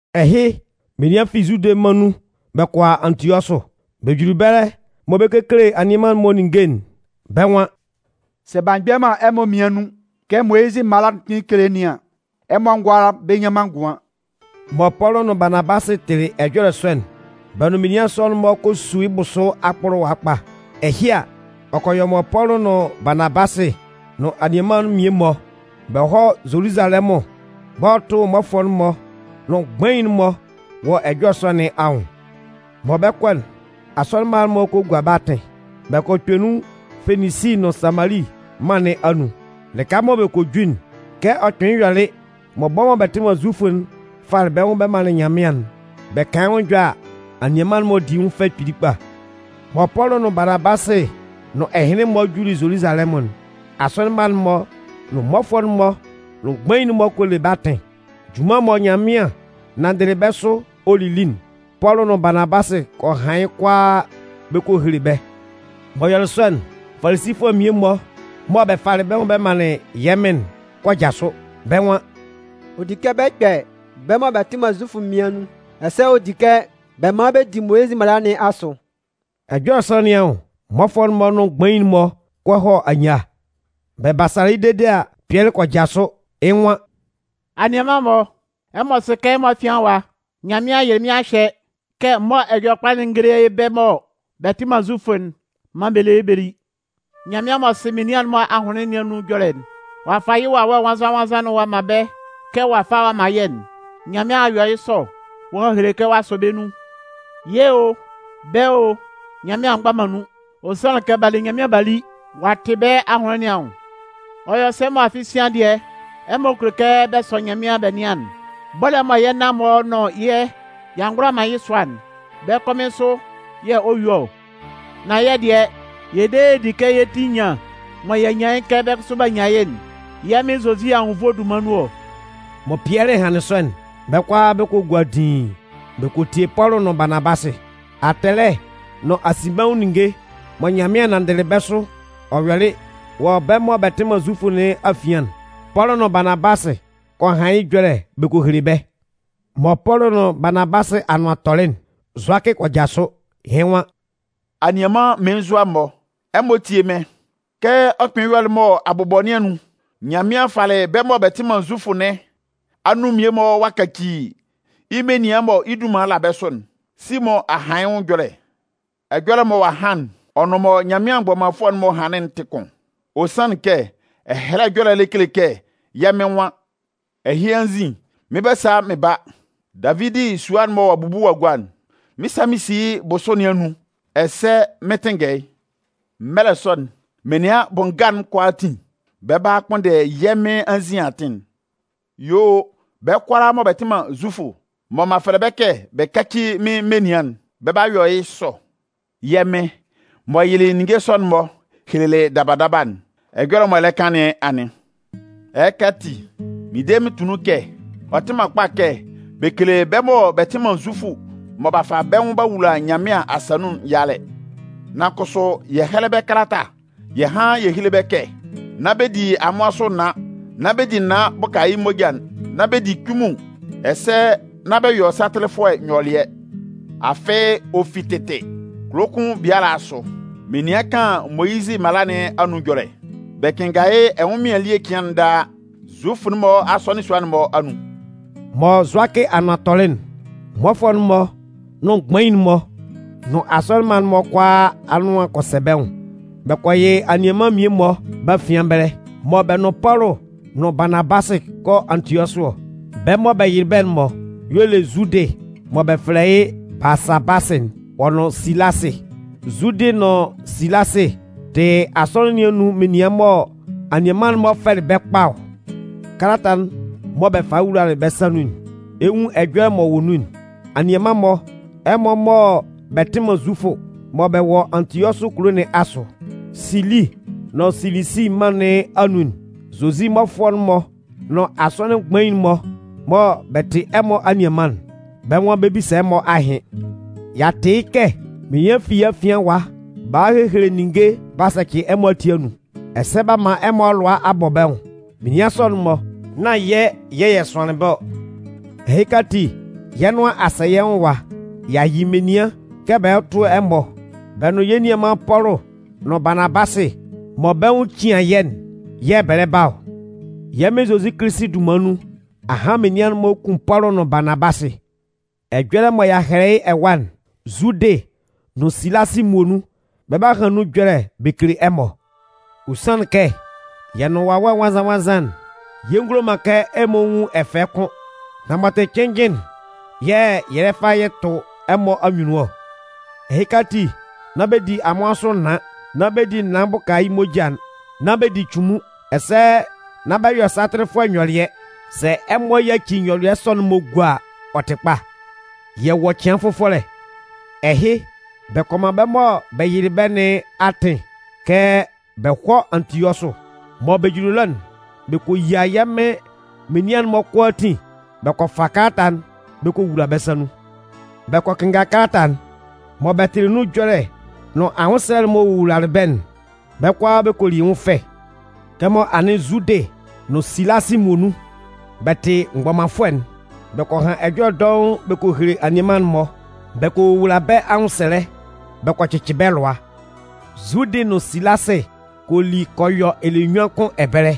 Ɛhɩ, menian fi Zude mân nun bɛ kɔ a Antiɔsʋ. Bɛ juli ɛbɛlɛ mɔ bɛ 'kekele anianman'n-mɔ ninnge'n, bɛ́ nwan: “Sɛ b'a mgbɛ man ɛmɔ mmian nun kɛ Moyizɩ mala'n kpɩn kele nɩn an, ɛmɔ ngʋala bɛ nnyan man ngʋan.” Mɔ Pɔlʋ nʋn Baanabasɩ tɩlɩ ɛjɔlɛ sɔ'n, bɛ nʋn menian sɔ'n-mɔ kɔ su yɩ́ bʋsʋ akpʋlʋwa kpa. Ɛhɩ a, ɔ kɔ yɔ mɔ Pɔlʋ nʋn Baanabasɩ nʋn anianman'n mmie-mɔ, bɛ hɔ́ Zoluzalɛmʋn bɛ hɔ́ tʋ́ mmɔfʋɛ'n-mɔ nʋn mgbain'n-mɔ wɔ ɛjɔlɛ sɔ nɩn anwʋn. Mɔ bɛ 'kɔ'n, asɔnɩn mma'n-mɔ kɔ gua bɛ́ atɩn. Bɛ kɔ kpɛ nun Feninsi nʋn Samali mân nɩn anun. Lɩka mɔ bɛ kɔ ju'n, kɛ ɔ kpɩnlɩn yɔlɩ mɔ bɛ́ mɔ bɛ tɩ man Zufʋ'n falɩ bɛ́ nwʋn bɛ manlɩn Nyanmɩan'n, bɛ kan yɩ́ nwʋn ɛjɔlɛ a, anianman'n-mɔ di yɩ́ nwʋn fɛ kpili kpa. Mɔ Pɔlʋ nʋn Baanabasɩ nʋn ɛhɩnlɩn-mɔ juli Zoluzalɛmʋn'n, asɔnɩn mma'n-mɔ nʋn mmɔfʋɛ'n-mɔ nʋn mgbain'n-mɔ kɔ le bɛ́ atɩn. Junman mɔ Nyanmɩan nanndɩlɩ bɛ́ sʋ ɔ lili'n, Pɔlʋ nʋn Baanabasɩ kɔ han yɩ́ kʋalaa bɛ kɔ hele bɛ́. M'ɔ yɔlɩ sɔ'n, Falisifʋɛ mmie-mɔ mɔ bɛ falɩ bɛ́ nwʋn bɛ manlɩn yɛ́ Mɩn'n kɔ jasʋ, bɛ́ nwan: “Ɔ di kɛ bɛ kpɛ bɛ́ mɔ bɛ tɩ man Zufʋ'n mmian nun, ɛsɛ ɔ di kɛ bɛ man bɛ di Moyizɩ mala nɩn asʋ.” Ɛjɔlɛ sɔ nɩn anwʋn, mmɔfʋɛ'n-mɔ nʋn mgbain'n-mɔ kɔ hɔ anyia. Bɛ basalɩ yɩ́ dede a, Pɩɛlɩ kɔ jasʋ, yɩ́ nwan: “Anianman-mɔ, ɛmɔ sɩ kɛ ɛmɔ afian ɛwa, Nyanmɩan yɩlɩ mɩ́n a hyɛ kɛ m mɔ́ Ɛjɔlɛkpa'n n géle bɛ́ mɔ bɛ tɩ man Zufʋ'n maan bɛ lé yɩ́ bɛ lí. Nyanmɩan m'ɔ sɩ menian'n-mɔ ahʋnlɩn nɩn anun ɛjɔlɛ'n, ɔ'a fa yɩ́ Wawɛ Nwannzan-nwannzan ɔ'a man bɛ́ kɛ ɔ'a fa ɔ'a man yɛ́'n. Nyanmɩan a yɔ sɔ ɔ'a hele kɛ ɔ'a sɔ bɛ́ nun. Yɛ́ o, bɛ́ o, Nyanmɩan a mgba man nun. Ɔ sanlɩn kɛ b'a le Nyanmɩan b'a li, ɔ'a tɩ bɛ́ ahʋnlɩn nɩn anwʋn. Ɔ yɔ sɛ mɔ afɩ sian dɩɛ, ɛmɔ kulo kɛ bɛ sɔ Nyanmɩan bɛ nɩan'n? Bɔ́lɛ mɔ yɛ́ nan-mɔ nʋn yɛ́ y'a ngʋala man yɩ́ sʋa'n, bɛ́ kɔmɩn sʋ yɛ̂ ɔ yúe ɔ? Nan yɛ̂ dɩɛ, yɛ de yɛ di kɛ yɛ́ ti enyan'n mɔ y'a nyan yɩ́ kɛ bɛ́ kʋsʋ b'a nyan yɩ́'n, yɛ́ Mɩn Zozi anwunnvoe'n dunman nun ɔ.” Mɔ Pɩɛlɩ hanlɩn sɔ'n, bɛ́ kʋalaa bɛ kɔ gua didiin, bɛ kɔ tie Pɔlʋ nʋn Baanabasɩ. Atɛlɛ nʋn asinbɛnwʋn ninnge mɔ Nyanmɩan nanndɩlɩ bɛ́ sʋ ɔ yɔlɩ wɔ bɛ́ mɔ bɛ tɩ man Zufʋ nɩn afian'n, Pɔlʋ nʋn Baanabasɩ kɔ han yɩ́ ɛjɔlɛ bɛ kɔ hele bɛ́. Mɔ Pɔlʋ nʋn Baanabasɩ anʋan tɔlɩ'n, Zʋakɩ kɔ jasʋ, yɩ́ nwan: “Anianman mmelenzua-mɔ, ɛmɔ tíe mɩ́n! Kɛ ɔ kpɩnlɩn yɔlɩ mɔ abʋbɔ nɩn anun Nyanmɩan falɩ bɛ́ mɔ bɛ tɩ man Zufʋ nɩn anun mmie-mɔ ɔ'a kaci yɩ́ menian mɔ yɩ́ dunman la bɛ́ sʋ'n, Simʋn a han yɩ́ nwʋn ɛjɔlɛ. Ɛjɔlɛ'n mɔ ɔ'a han'n, ɔ nʋn mɔ Nyanmɩan mgbɔmanfʋɛ'n-mɔ hanlɩn'n tɩ kʋn. Ɔ sanlɩn kɛ Ɛhɛlɛ Ɛjɔlɛ'n le kele kɛ yɛ́ Mɩn nwan: Ɛhɩ anzin, mɩn 'ba sa mɩn ba. Davidi sua'n mɔ ɔ'a bubu ɔ a gua'n, mɩn 'sa mɩn si yɩ́ bʋsʋ nɩn anun ɛsɛ mɩn 'tɩnngɛ yɩ́. Mɛlɛ sɔ'n, menian bʋ nga'n kʋalaatin, bɛ 'ba kpʋnndɛ yɛ́ Mɩn anzin atɩn. Yuo, bɛ́ kʋalaa mɔ bɛ tɩ man Zufʋ mɔ m'an fɛlɛ bɛ́ kɛ bɛ káci mɩ́n menian'n, bɛ 'ba yɔ yɩ́ sɔ. Yɛ́ Mɩn m'ɔ yɩlɩ ninnge sɔ'n-mɔ helelɩ daba daba'n, ɛjɔlɛ m'ɔ lɛ kan nɩn anɩn. “Ɛhɩka ati, mɩn de mɩn tʋ nun kɛ ɔ tɩ man kpa kɛ bɛ kele bɛ́ mɔ bɛ tɩ man Zufʋ mɔ b'a fa bɛ́ nwʋn b'a wula Nyanmɩan asa nun'n yalɛ. Nan kʋsʋ, yɛ hɛ́lɛ bɛ́ kalata yɛ hán yɛ héle bɛ́ kɛ nán bɛ di amʋan sʋ naan, nán bɛ di naan bʋka yɩ́ moja'n, nán bɛ di cunmun, ɛsɛ nán bɛ yɔ satɩlɩfʋɛ nyɔlɩɛ. Afɩ, ɔ fi tɩtɩ, kulo kʋn biala asʋ, menian kan Moyizɩ mala nɩn anun ɛjɔlɛ. Bɛ kɩnnga yɩ́ ɛnwʋnmɩan ele cɩan daa Zufʋ-mɔ asɔnɩn sua'n-mɔ anun.” Mɔ Zʋakɩ anʋan tɔlɩ'n, mmɔfʋɛ'n-mɔ nʋn mgbain-mɔ nʋn asɔnɩn mma'n-mɔ kʋalaa anʋan kɔ sɛ bɛ́ nwʋn. Bɛ kɔ yɩ anianman mmie-mɔ bɛ́ afian ɛbɛlɛ mɔ bɛ nʋn Pɔlʋ nʋn Baanabasɩ 'kɔ Antiɔsʋ ɔ. Bɛ́ mɔ bɛ yɩlɩ bɛ́'n-mɔ y'ɔ le Zudɩ mɔ bɛ fɛlɛ yɩ́ Baasabasɩ'n, ɔ nʋn Silasɩ. Zudɩ nʋn Silasɩ tɩ asɔnɩn nɩn anun menian mɔ anianman'n-mɔ fɛlɩ bɛ́ kpa ɔ. Kalata'n mɔ bɛ falɩ wulalɩ bɛ́ sa nun'n, ɛ 'nwun ɛjɔlɛ m'ɔ wɔ nun'n: Anianman-mɔ, Ɛmɔ mɔ bɛ tɩ man Zufʋ mɔ bɛ wɔ Antiɔsʋ kulo nɩn asʋ, Sili nʋn Silisi mân nɩn anun'n, Zozi mmɔfʋɛ'n-mɔ nʋn asɔnɩn mgbain'n-mɔ mɔ bɛ tɩ ɛmɔ anianman'n, bɛ́ nwan bɛ 'bisa ɛmɔ ahɩn. Y'a tɩ yɩ́ kɛ menian fi yɛ́ afian ɛwa b'a hɔ a hehele ninnge b'a sɛcɩ ɛmɔ ati anun, ɛsɛ b'a man ɛmɔ lʋa a bɔ bɛ́ nwʋn. Menian sɔ'n-mɔ, nán yɛ́ yɛ̂ yɛ sʋanlɩn bɛ́ ɔ. Ɛhɩka ati, yɛ́ nʋan a sɛ yɛ́ nwʋn ɛwa, y'a yɩ menian kɛ bɛ hɔ́ tʋ́ ɛmɔ. Bɛ nʋn yɛ́ nianman Pɔlʋ nʋn Baanabasɩ mɔ bɛ́ nwʋn cian yɛ́'n yɛ̂ bɛ lɛ ba ɔ. Yɛ́ Mɩn Zozi Kilisi dunman nun, ahan menian'n-mɔ 'kun Pɔlʋ nʋn Baanabasɩ. Ɛjɔlɛ mɔ y'a hɛlɛ yɩ́ ɛwa'n, Zudɩ nʋn Silasɩ muonun, bɛ 'ba han nun ɛjɔlɛ bɛ kele ɛmɔ. Ɔ sanlɩn kɛ yɛ nʋn Wawɛ Nwannzan-nwannzan'n, yɛ ngulo man kɛ ɛmɔ nwun ɛfɛ kʋ́n. Nan m'ɔ tɩ cɩnnjɩn'n yɛ̂ yɛ lɛ fa yɛ tʋ ɛmɔ anyunnun ɔ. Ɛhɩka ati, nán bɛ di amʋan sʋ naan, nán bɛ di naan bʋka yɩ́ moja'n, nán bɛ di cunmun. Ɛsɛ nán bɛ yɔ satɩlɩfʋɛ nyɔlɩɛ. Sɛ ɛmɔ yaci nyɔlɩɛ sɔ'n-mɔ gua a, ɔ tɩ kpa. Yɛ wɔ cɩan fʋfɔlɛ! Ɛhɩ, bɛ kɔ man bɛ́ mɔ bɛ yɩlɩ bɛ́ nɩn atɩn kɛ bɛ hɔ́ Antiɔsʋ. Mɔ bɛ juli ɛlɔ'n, bɛ kɔ yia yɛ́ Mɩn menian'n-mɔ kʋalaatin bɛ kɔ fa kalata'n bɛ kɔ wula bɛ́ sa nun. Bɛ kɔ kɩnnga kalata'n. Mɔ bɛ tɩlɩ nun ɛjɔlɛ nʋn anwʋnsɛlɛ'n m'ɔ wowulalɩ bɛ́'n, bɛ́ kʋalaa bɛ kɔ li yɩ́ nwʋn fɛ. Kɛmɔ anɩn Zudɩ nʋn Silasɩ muonun, bɛ tɩ mgbɔmanfʋɛ'n, bɛ kɔ han ɛjɔlɛ dɔʋn bɛ kɔ hele anianman'n-mɔ bɛ kɔ wowula bɛ́ anwʋnsɛlɛ bɛ kɔ cɩcɩ bɛ́ lʋa. Zudɩ nʋn Silasɩ kɔ li kɔ yɔ ɛlɛnyuan kʋn ɛbɛlɛ.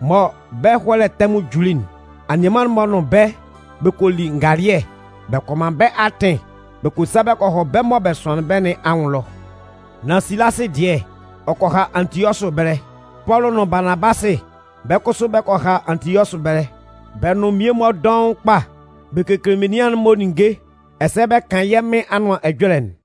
Mɔ bɛ́ ɛhɔlɛ tɛmʋn juli'n, anianman'n-mɔ nʋn bɛ́ bɛ kɔ li ngalɩɛ bɛ kɔ man bɛ́ atɩn bɛ kɔ sa bɔ kɔ hɔ bɛ́ mɔ bɛ sʋanlɩn bɛ́ nɩn anwʋn ɛlɔ. [ Nan Silasɩ dɩɛ, ɔ kɔ ha Antiɔsʋ ɛbɛlɛ.] Pɔlʋ nʋn Baanabasɩ, bɛ́ kʋsʋ bɛ kɔ ha Antiɔsʋ ɛbɛlɛ. Bɛ nʋn mmie-mɔ dɔʋn kpa bɛ kekele menian'n-mɔ ninnge ɛsɛ bɛ kan yɛ́ Mɩn Anʋan Ɛjɔlɛ'n.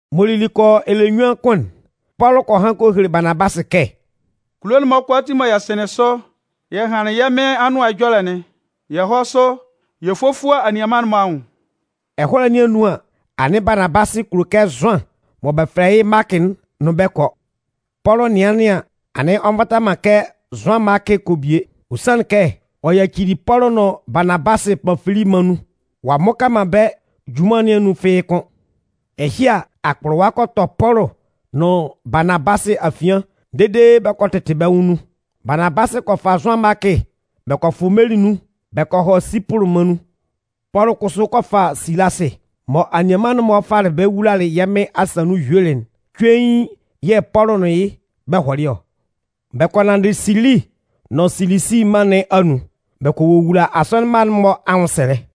M'ɔ lili kɔ yɔ ɛlɛnyuan kʋn'n, Pɔlʋ kɔ han kɔ hele Baanabasɩ kɛ: “Kulo'n-mɔ kʋalaatin mɔ yɛ sɩnlɩn sʋ yɛ hanlɩn yɛ́ Mɩn Anʋan Ɛjɔlɛ'n, yɛ hɔ́ sʋ yɛ fófua anianman'n-mɔ anwʋn.” Ɛhɔlɛ nɩn anun an, anɩn Baanabasɩ kulo kɛ Zʋan mɔ bɛ fɛlɛ yɩ́ Maakɩ'n nʋn bɛ́ kɔ. Pɔlʋ nɩanlɩn an, anɩn ɔ nvata man kɛ Zʋan Maakɩ kɔ bie. Ɔ sanlɩn kɛ, ɔ yacili Pɔlʋ nʋn Baanabasɩ Panfili mân nun, ɔ a mmʋka man bɛ́ junman nɩn anun fɩ́ɩ́ kʋ́n. Ɛhɩ a, akpʋlʋwa kɔ tɔ Pɔlʋ nʋn Baanabasɩ afian dede bɛ kɔ tɩtɩ bɛ́ nwʋn nun. Baanabasɩ kɔ fa Zʋan Maakɩ bɛ kɔ fʋ meli nun bɛ kɔ hɔ Sipʋlʋ mân nun. Pɔlʋ kʋsʋ kɔ fa Silasɩ. Mɔ anianman'n-mɔ falɩ bɛ́ wulalɩ yɛ́ Mɩn asa nun yuelɩ'n, cuein, yɛ̂ Pɔlʋ nʋn yɩ́, bɛ hɔlɩ ɔ. Bɛ kɔ nanndɩ Sili nʋn Silisi mân nɩn anun. Bɛ kɔ wowula asɔnɩn mma'n-mɔ anwʋnsɛlɛ.